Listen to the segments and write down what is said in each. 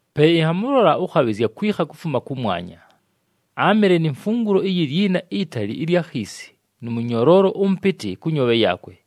Pe ɨnhamʉlola ʉkhabhɨzya akwikha kufuma kʉmwanya. Áamɨle ni mfungulo iyi lyina itali ɨlya khiisi nʉ mʉnyoloolo ʉmʉpɨtɨ kʉ nyoobhe yaakwe.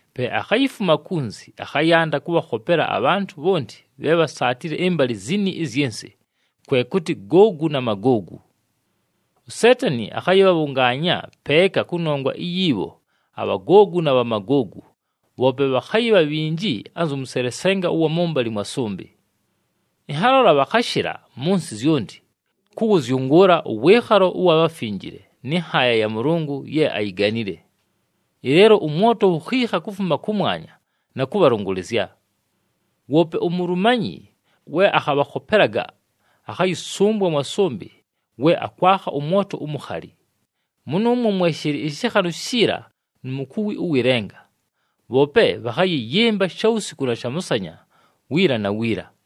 Pe akhayifuma kunzi, akhayanda kʉbhakhopela abhantʉ bhonti bhe bhasaatile ɨmbalɨ zini ɨzyɨ nsɨ, kwe kʉtɨ Googu na Magoogu. USeetani akhayɨbhabhʉngaanya peeka kʉnongwa iyi bho aBhagoogu na Bhamagoogu, bhoope bhakhayɨbha bhinji anzʉ mʉselesenga ʉwa mʉmbalɨ mwa sʉmbɨ. Ɨnhalola bhakhashɨla mʉ nsɨ zyonti, kʉwʉzyʉngʉʉla ʉwɨɨkhalo ʉwa bhafinjile nɨ nhaaya ya Mʉlʉngʉ ye ayiganile. Ɨleelo ʉmwoto wukhiikha kufuma kʉmwanya na kʉbhalʉngʉlɨzya. Woope uMulumanyi we akhabhakhopelaga, akhayɨsʉmbwa mwa sʉmbɨ we akwakha ʉmwoto umukhali. Mʉnʉʉmwo mwe shɨlɨ ɨshɨkhanʉ shiila nu mukuwi ʉwɨ lenga, bhoope bhakhayɨyɨmba shawusiku na shamʉsanya, wiila na wiila.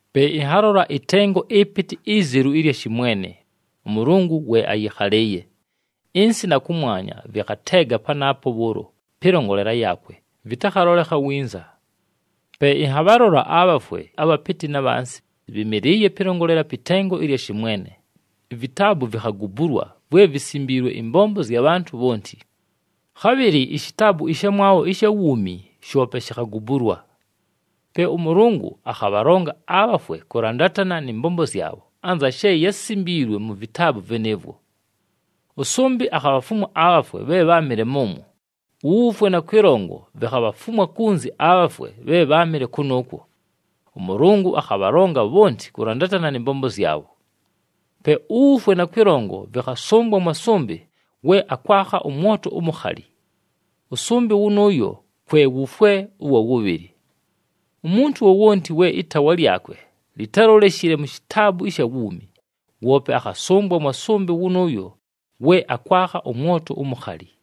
Pe ɨnhalola ɨtengo ɨpɨtɨ izelu ɨlya shɨmwene, ʉMʉlʉngʉ we ayɨkhalɨɨye. Ɨnsɨ na kʉmwanya vɨkhateega panaapo bhʉʉlo pɨlongolela yaakwe, vɨtakhalolekha winza. Pe ɨnhabhalola abhafwe, abhapɨtɨ na bhansi, bhɨmɨlɨɨye pɨlongolela pɨ tengo ɨlya shɨmwene, ivitaabu vikhagubulwa vwe visimbiilwe ɨmbombo zya bhantʉ bhonti. Khabhɨlɨ ishitaabu ɨshamwabho ɨsha wuumi shoope shikhagubulwa. Pe ʉMʉlʉngʉ akhabhalonga abhafwe kʉlandatana nɨ mbombo zyabho, anza she yásimbiilwe mu vitaabu vɨnɨɨvwo. Ʉsʉmbɨ akhabhafumwa abhafwe bhe bháamɨle mʉnʉʉmwo, uWufwe na Kwɨlongo vikhabhafumwa kunzi abhafwe bhe bháamɨle kʉnʉʉkwo. ɄMʉlʉngʉ akhabhalonga bhonti kʉlandatana nɨ mbombo zyabho. Pe uWufwe na Kwɨlongo vɨkhasʉmbwa mwa sʉmbɨ we akwakha ʉmwoto umukhali. Ʉsʉmbɨ wʉnʉʉyo kwe wufwe ʉwa wʉbhɨlɨ. Umuntu wowonti we ɨtaawa lyakwe litáloleshile mu shitaabu ɨsha wuumi, woope akhasʉmbwa mwa sʉmbɨ wʉnʉʉyo we akwakha ʉmwoto umukhali.